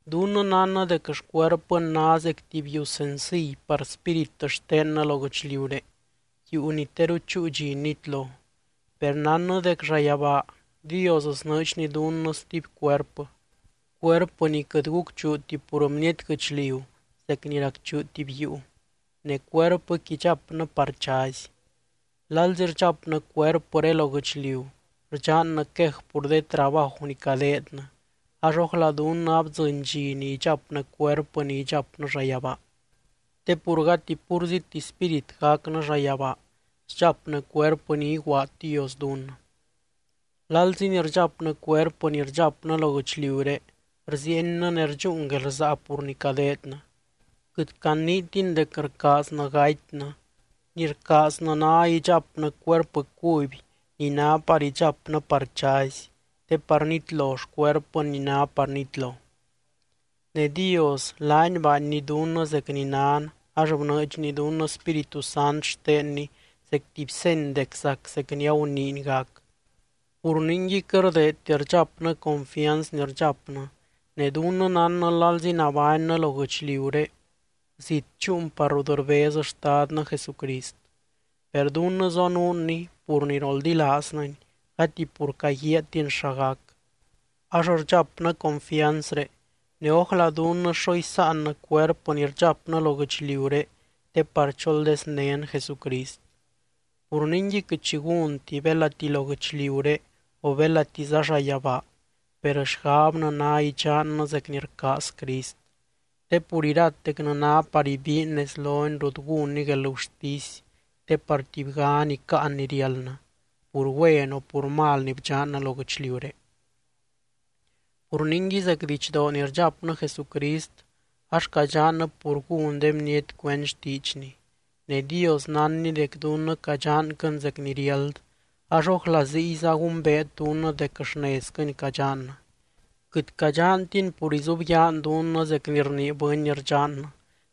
Dunnɨ nánnɨ dec xcuerpɨn ná zec tuby yuu senciy par spírit xtennɨ lo guɨchliuré, yuu ni teru chúu dxi nitlo. Per nánnɨ dec llayabaa Dios snɨɨdxny dunnɨ stuby cuerpɨ, cuerpɨ ni quɨt gucchuuti pur bniety guɨchliu zec ni racchuu tuby yuu, ne cuerpɨqui idxapnɨ par chazy. Lalzi rdxapnɨ cuerpɨré lo guɨchliu, rdxannɨ quej pur de trabaju ni cadeednɨ, ax ójla dunnɨ abdzɨny dxi ni idxapnɨ cuerpɨ ni idxapnɨ llayabaa. Te pur gati púrziti spírit gacnɨ llayabaa, sdxapnɨ cuerpɨ ni iguaad Dios dunnɨ. Lalzi ni rdxapnɨ cuerpɨ ni rdxapnɨ lo guɨchliuré, rziiennɨ ne rdxúun guelrsaa pur ni cadeednɨ. Quɨt caniitin dec rcaaznɨ gatynɨ, ni rcaaznɨ ná idxapnɨ cuerpɨ cuby ni ná par idxapnɨ par chazy te par nitlo xcuerpɨn ni ná par nitlo. Ne Dios, laany baanny dunnɨ zec ni nan ax bnɨɨdxny dunnɨ Spíritu Sant xtenny zec tuby seny dec zac zec ni aguniiny gac. Pur ningui quɨt rdeedti rdxapnɨ confianz ni rdxapnɨ, ne dunnɨ nánnɨ lalzi nabánnɨ lo guɨchliuré, zit dxúun par rut rbez Xtadnɨ Jesucrist. (Per dunnɨ zonuunny pur ni roldilaaznɨny gati pur caguiaatin xa gac.) Ax rdxapnɨ confianzré, ne ójla dunnɨ xo isáannɨ cuerpɨ ni rdxapnɨ lo guɨchliuré te par choldeznén Jesucrist. Pur ningui quɨt xi gúnti, belati lo guɨchliuré o belatiza llayabaa, per xgabnɨ ná idxannɨ zec ni rcaaz Crist. Te pur iratecnɨ ná par ibiin nez lony rut gúnny guelgurtisy te par tubygan icáan ni riáldnɨ, pur güen o pur mal ni bdxannɨ lo guɨchliuré. Pur ningui zec didxdoo ni rdxapnɨ Jesucrist, ax cadxannɨ pur gún de bniety cuend xtiidxny. Ne Dios nánny dec dunnɨ cadxanquɨn zec ni riáld, ax ójla ziyza gumbeet dunnɨ dec xnezquɨni cadxannɨ. Quɨt cadxantin pur izubyaan dunnɨ zec ni rnii bɨny rdxannɨ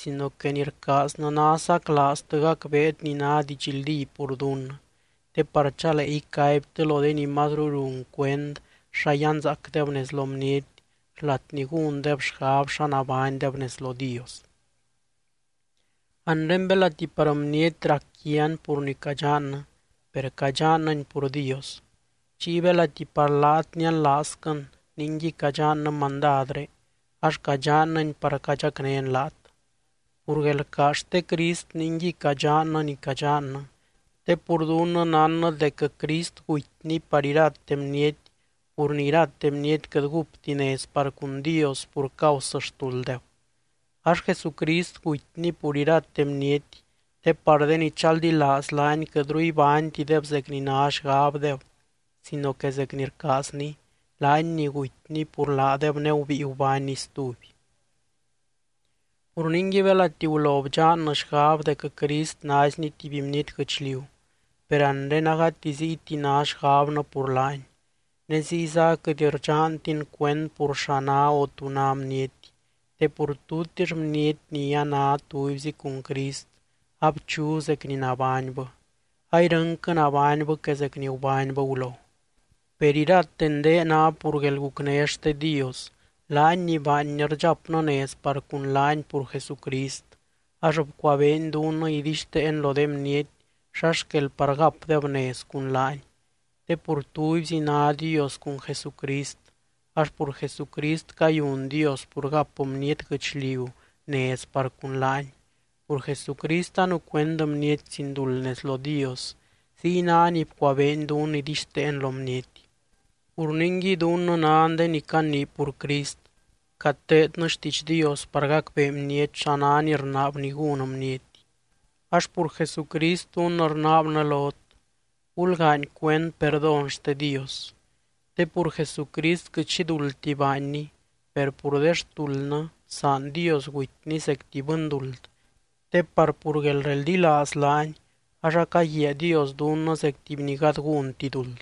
sino que ni rcaaznɨ ná saclaaztɨ gacbeet ni ná didxldí pur dunnɨ, te par chalee icaibtɨ lo de ni mazru run cuend xa yanzaacdeb nez lo bniety xlat ni gúndeb xgab xa nabánydeb nez lo Dios. Anre belati par bniety rac quian pur ni cadxannɨ, per cadxannɨni pur Dios. Chiy belati par laat nianlaazquɨn ningui cadxannɨ mandadré, ax cadxannɨni par cadxacnén laat. Pur guelrcaaz xte Crist ningui cadxannɨ ni cadxannɨ, te pur dunnɨ nánnɨ dec Crist gutyny par irate bniety pur ni irate bniety quɨt gúpti nez par cun Dios pur causɨ xtulddeb. Ax Jesucrist gutyny pur irate bniety te par de ni chaldilaaz laany quɨtru ibánytideb zec ni ná xgabdeb sino que zec ni rcaazny, laany ni gutyny pur laadeb ne gubíi gubánny stuby. Pur ningui belati gulo bdxannɨ xgab dec Crist naizny tuby bniety guɨchliu, per anre agati ziyti ná xgabnɨ pur laany. Ne ziyza aquɨt rdxantin cuend pur xa ná o tú ná bniety, te pur tutix bniety ni a ná tubyzi cun Crist, abchu zec ni nabánybɨ. Airɨnquɨ nabánybɨ que zec ni gubánybɨ gulo. Per irate ndee ná pur guelgucné xte Dios, laany ni baanny rdxapnɨ nez par cun laany pur Jesucrist, ax bcuabeeny dunnɨ idixteen lo de bniety xa xquel par gapdeb nez cun laany. Te pur tubyzi ná Dios cun Jesucrist ax pur Jesucrist cayun Dios pur gap bniety guɨchliu nez par cun laany, pur Jesucrist anucuend bniety sin duld nez lo Dios, ziy ná ni bcuabeeny dunnɨ idixteen lo bniety. Pur ningui dunnɨ nan de ni canii pur Crist, cateednɨ xtiidx Dios par gacbee bniety xa ná ni rnaabny gún bniety. Ax pur Jesucrist dunnɨ rnaabnɨ lot: Gulgaany cuend perdón xte Dios. Te pur Jesucrist quɨt xi duldti baanny, per pur de xtuldnɨ bsaan Dios gutyny zec tuby bɨnduld te par pur guelreldilaaz laany, ax acaguiaa Dios dunnɨ zec tuby ni gady gúnti duld.